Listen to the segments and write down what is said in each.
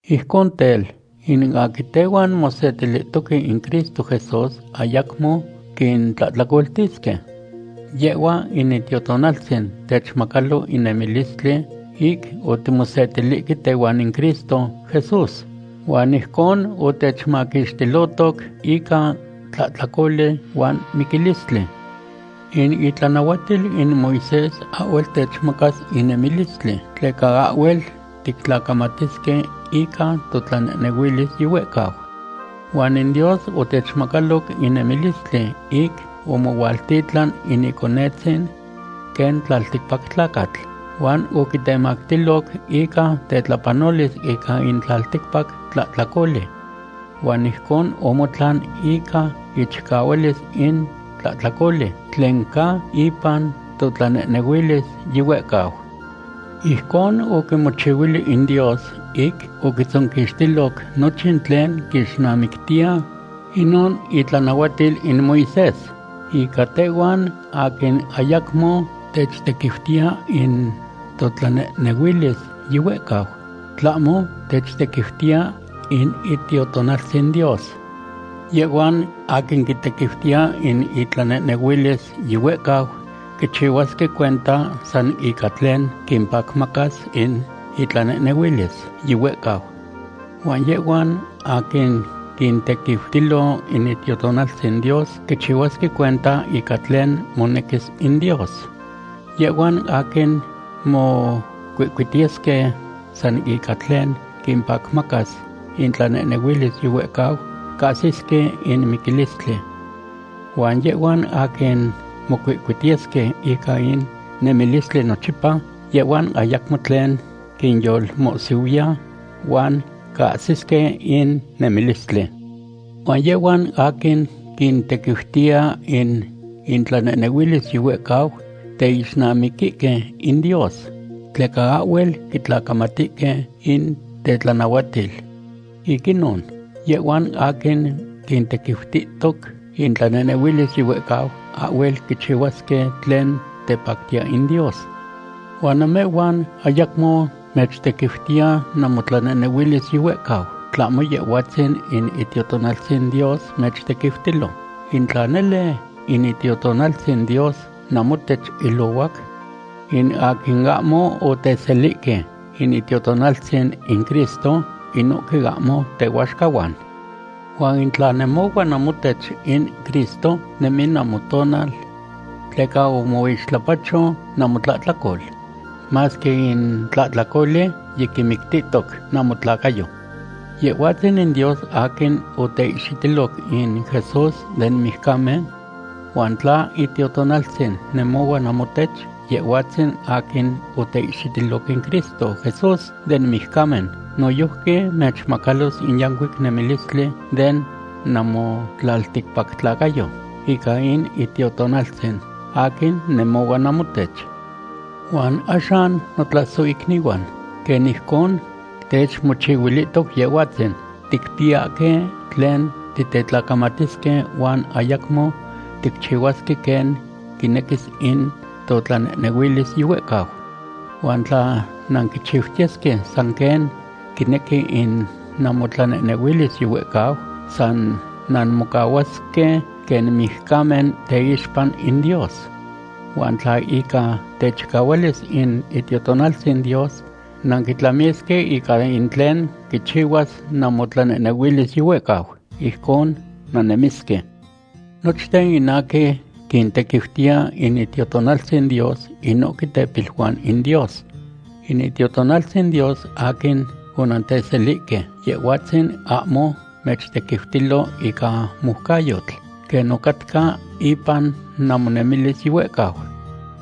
Ijcon tel, in aquin tehuan mosetilihtoque in Cristo Jesús ayacmo quintlahtlacoltisque. Yehhua in Itiotonaltzin techmacalo in nemilistli ic otimosetilihque tehuan in Cristo Jesús. Huan ijcon otechmaquixtilohtoc ica tlahtlacoli huan miquilistli. In itlanahuatil in Moisés ahhuel techmacas in nemilistli, tleca ahhuel tictlacamatisque ica totlanehnehuilis yihuehcau. Huan in Dios otechmacaloc in nemilistli ic omohualtitlan in Iconetzin quen tlalticpac tlacatl, huan oquitemactiloc ica tetlapanolis ica in tlalticpac tlahtlacoli. Huan ijcon omotlan ica ichicahualis in tlahtlacoli tlen ca ipan totlanehnehuilis yihuehcau. Ijcon oquimochihuili in Dios ic oquitzonquixtiloc nochin tlen quixnamictiya inon itlanahuatil in Moisés ica tehhuan aquin ayacmo techtequiutiya in totlanehnehuilis yihuehcau, tlahmo techtequiutiya in Itiotonaltzin Dios. Yehhuan aquin quitequiutiya in intlanehnehuilis yihuehcau quichihuasque cuenta san ica tlen quimpacmacas in intlanehnehuilis yihuehcau. Huan yehhuan aquin quintequiutilo in Itiotonaltzin Dios quichihuasque cuenta ica tlen monequis in Dios. Yehhuan aquin mocuihcuitiyesque san ica tlen quimpacmacas intlanehnehuilis yihuehcau cahsisque in miquilistli. Huan yehhuan aquin mocuihcuitiyesque ica in nemilistli nochipa, yehhuan ayacmo tlen quinyolmohsihuiya huan cahsisque in nemilistli. Huan yehhuan aquin quintequiutiya in intlatlanehnehuilis yihuehcau teixnamiquihque in Dios, tleca ahhuel quitlacamatihque in tetlanahuatil. Ic inon, yehhuan aquin quintequiutihtoc intlanehnehuilis yihuehcau ahhuel quichihuasque tlen tepactiya in Dios. Huan namehhuan ayacmo mechtequiutiya namotlanehnehuilis yihuehcau, tlahmo Yehhuatzin in Itiotonaltzin Dios mechtequiutilo, in tla nele in Itiotonaltzin Dios namotech ilohuac. In aquin ahmo oteselihque in Itiotonaltzin in Cristo, inohque ahmo tehuaxcahuan. Huan in tla nemohua namotech in Cristo, nemi namotonal. Tleca omoixtlapacho namotlahtlacol, masque in tlahtlacoli yiquimictihtoc namotlacayo. Yehhuatzin in Dios aquin oteihxitiloc in Jesús den mijcamen. Huan tla Itiotonaltzin nemohua namohtech, Yehhuatzin aquin oteihxitiloc in Cristo Jesús den mijcamen noyojqui mechmacalos in yancuic nemilistli den namotlalticpactlacayo ica in Itiotonaltzin, aquin nemohua namohtech. Huan axan notlasohicnihuan, quen ijcon techmochihuilihtoc Yehhuatzin, ticpiyahque tlen titetlacamatisque huan ayacmo ticchihuasque quen quinequis in totlanehnehuilis yihuehcau. Huan tla nanquichiutiyesque san quen quinequi in namotlanehnehuilis yihuehcau, san nanmocahuasque quen mijcamen teixpa in Dios. Huan tla ica techicahuilis in Itiotonaltzin Dios nanquitlamisque ica in tlen quichihuas namotlanehnehuilis yihuehcau, ijcon nannemisque. Nochten in aquin quintequiutiya in Itiotonaltzin Dios, inohque tepiluan in Dios. In Itiotonaltzin Dios aquin onanteselihque, Yehhuatzin ahmo mechtequiutilo ica moucayotl, quen ocatca ipan namonemilis yihuehcau.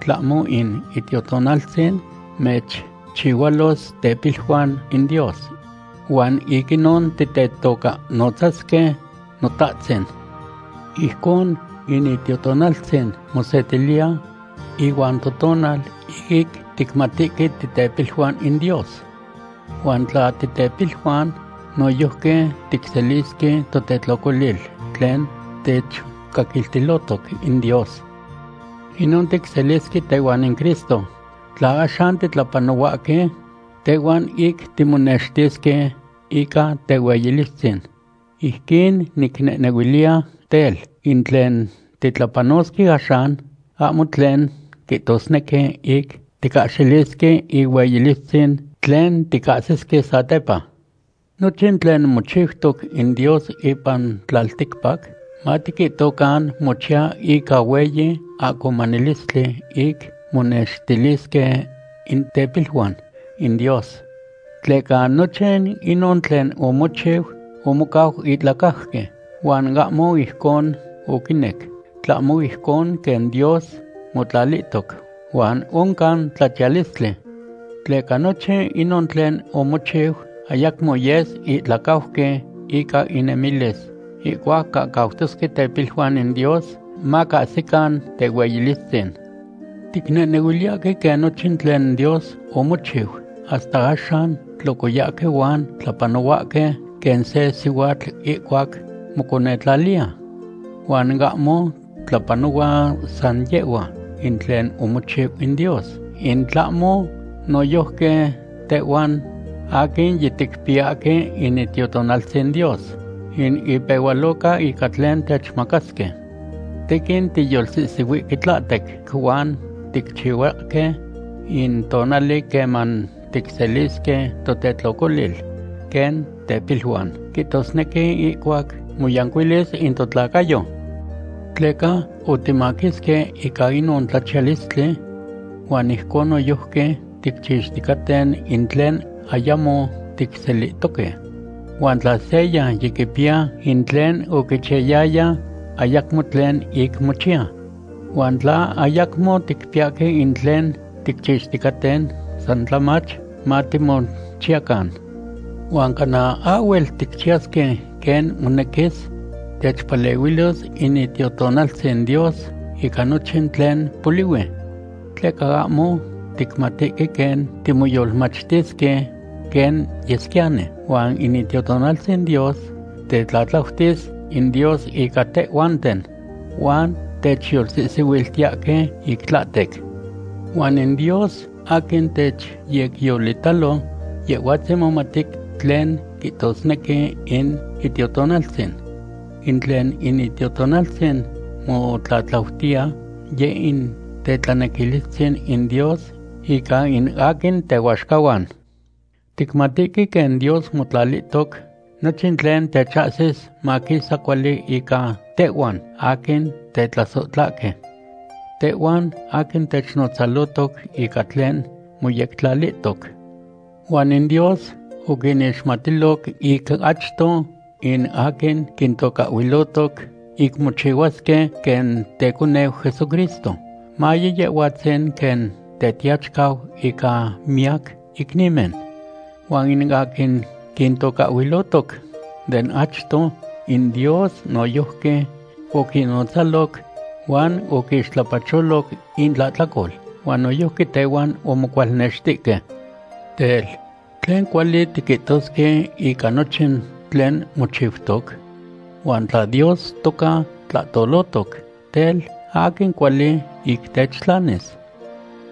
Tlahmo in Itiotonaltzin mechchihualos tepiluan in Dios. Huan ic inon titetocahnotzasque: “Notahtzin.” Ijcon in Itiotonaltzin mosetiliya ihuan totonal ic ticmatihque titepiluan in Dios. Huan tla titepiluan, noyojqui ticselisque totetlocolil tlen techcaquiltilohtoc in Dios. Inon ticselisque tehuan in Cristo tla axan titlapanohuahque tehuan ic timonextisque ica tehueyilistzin. Ijquin nicnehnehuiliya tel, in tlen titlapanosque axan, ahmo tlen quihtosnequi ic ticahxilisque ihueyilistzin tlen ticahsisque satepa. Nochin tlen mochiutoc in Dios ipan tlalticpac, matiquihtocan mochiya ica hueyi ahcomanilistli ic monextilisque in tepiluan in Dios. Tleca nochin inon tlen omochiu omocau ihtlacajqui, huan ahmo ijcon oquinec, tlahmo ijcon quen Dios motlalihtoc, huan oncan tlachiyalistli. Tleca nochin inon tlen omochiu ayacmo yes ihtlacajqui ica inemilis ihcuac cahcautosque tepiluan in Dios macahsican tehueyilistzin. Ticnehnehuiliyahque quen nochin tlen Dios omochiu hasta axan tlocoyahque huan tlapanohuahque quen se sihuatl ihcuac moconetlaliya. Huan ahmo tlapanohua san yehhua in tlen omochiu in Dios, in tlahmo noyojqui tehhuan aquin yiticpiyahque in Itiotonaltzin Dios, in ipehualoca ica tlen techmacasque. Tequin tiyolsihsihuihque tlahtec huan ticchiyahque in tonali queman ticselisque totetlocolil quen tepiluan, quihtosnequi ihcuac moyancuilis in totlacayo. Tleca otimaquisque ica inon tlachiyalistli. Huan ijcon noyojqui ticchixticaten in tlen ayamo ticselihtoque. Huan tla seya yiquipiya in tlen oquichiyaya, ayacmo tlen ic mochiya. Huan tla ayamo ticpiyahque in tlen ticchixticaten, san tlamach matimochiyacan. Huan cana ahhuel ticchiyasque quen monequis, techpalehuilos in Itiotonaltzin Dios ica nochin tlen polihui. Tleca ahmo ticmatihque quen timoyolmachtisque quen yesquiyani, huan in Itiotonaltzin Dios tetlatlautis in Dios ica tehhuanten huan techyolsihsihuiltiyahque ic tlahtec. Huan in Dios aquin techyecyolitalo, Yehhuatzin momati tlen quihtosnequi in Itiotonaltzin. In tlen in Itiotonaltzin motlatlautiya, yeh in tetlanequilistzin in Dios ica in aquin tehuaxcahuan. Ticmatihque quen Dios motlalihtoc nochin tlen techahsis maquisa cuali ica tehhuan aquin tetlasohtlahque. Tehhuan aquin technotzalotoc ica tlen moyectlalihtoc. Huan in Dios oquinixmatiloc ic achto in aquin quintocahhuilotoc ic mochihuasque quen teconeu Jesucristo, maye Yehhuatzin quen Tetiachicau ica miyac icnimen. Huan in aquin quintocahhuilohtoc de achto in Dios, noyojqui oquinnotzaloc, huan oquixtlapacholoc intlahtlacol, huan noyojqui tehuan omocualnextihque. Tel, ¿tlen cuali tiquihtosque ica nochin tlen mochiutoc? Huan tla Dios toca tlahtolohtoc, tel, ¿aquin cuali ic techtlanis?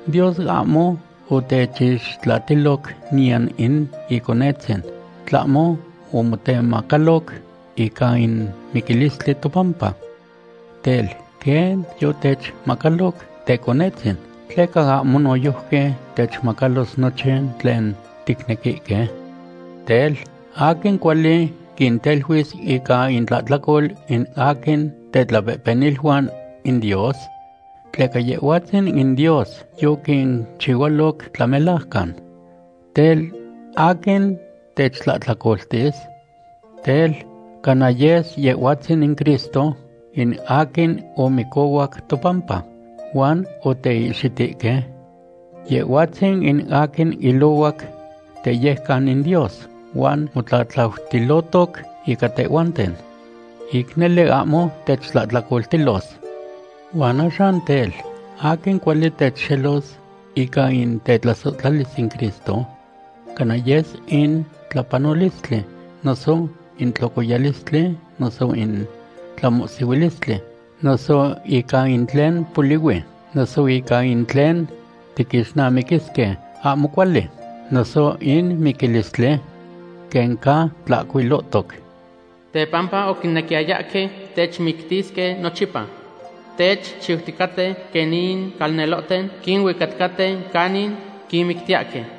Dios ahmo otechixtlatiloc niyan in Iconetzin, tlahmo omotemacaloc ica in miquilistli topampa. Tel, quen yotechmacaloc Teconetzin, ¿tleca ahmo noyojqui techmacalos nochin tlen ticnequihque? Tel, ¿aquin cuali quinteluis ica intlahtlacol in aquin tetlapehpeniluan in Dios? Tleca Yehhuatzin in Dios yoquinchihualoc tlamelajcan. Tel, ¿aquin techtlahtlacoltis? Tel, ¿cana yes Yehhuatzin in Cristo in aquin omicohuac topampa, huan oteihxitihque? Yehhuatzin in aquin ilohuac teyejcan in Dios huan motlatlautilotoc ica tehhuaten. Ic nele ahmo techtlahtlacoltilos. Huan axan tel, ¿aquin cuali techxelos ica in tetlasohtlalis in Cristo? ¿Cana yes in tlapanolistli, noso in tlocoyalistli, noso in tlamohsihuilistli, noso ica in tlen polihui, noso ica in tlen tiquixnamiquisque ahmo cuali, noso in miquilistli? Quen ca tlahcuilotoc: Tepampa oquinequiyayahque techmictisque nochipa. Techchiuticaten quen in calnelohten quinuicaticaten canin quinmictiyahque.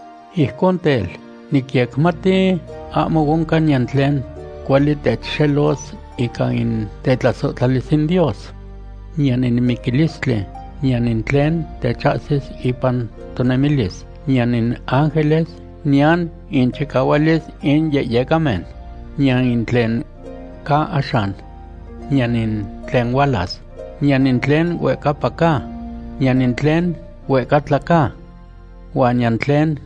Ijcon tel, nicyecmati ahmo oncan niyan tlen cuali techxelos ica in tetlasohtlalis in Dios. Niyan in miquilistli, niyan in tlen techahsis ipan tonemilis, niyan in ángeles, niyan inchicahualis in yehyecamen, niyan in tlen ca axan, niyan in tlen hualas, niyan in tlen huehcapa ca, niyan in tlen huehcatla ca. Huan niyan tlen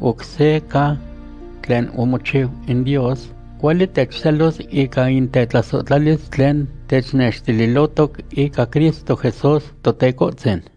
oc se ca tlen omochiu in Dios cuali techxelos ica in tetlasohtlalis tlen technextililohtoc ica Cristo Jesús Totecohtzin.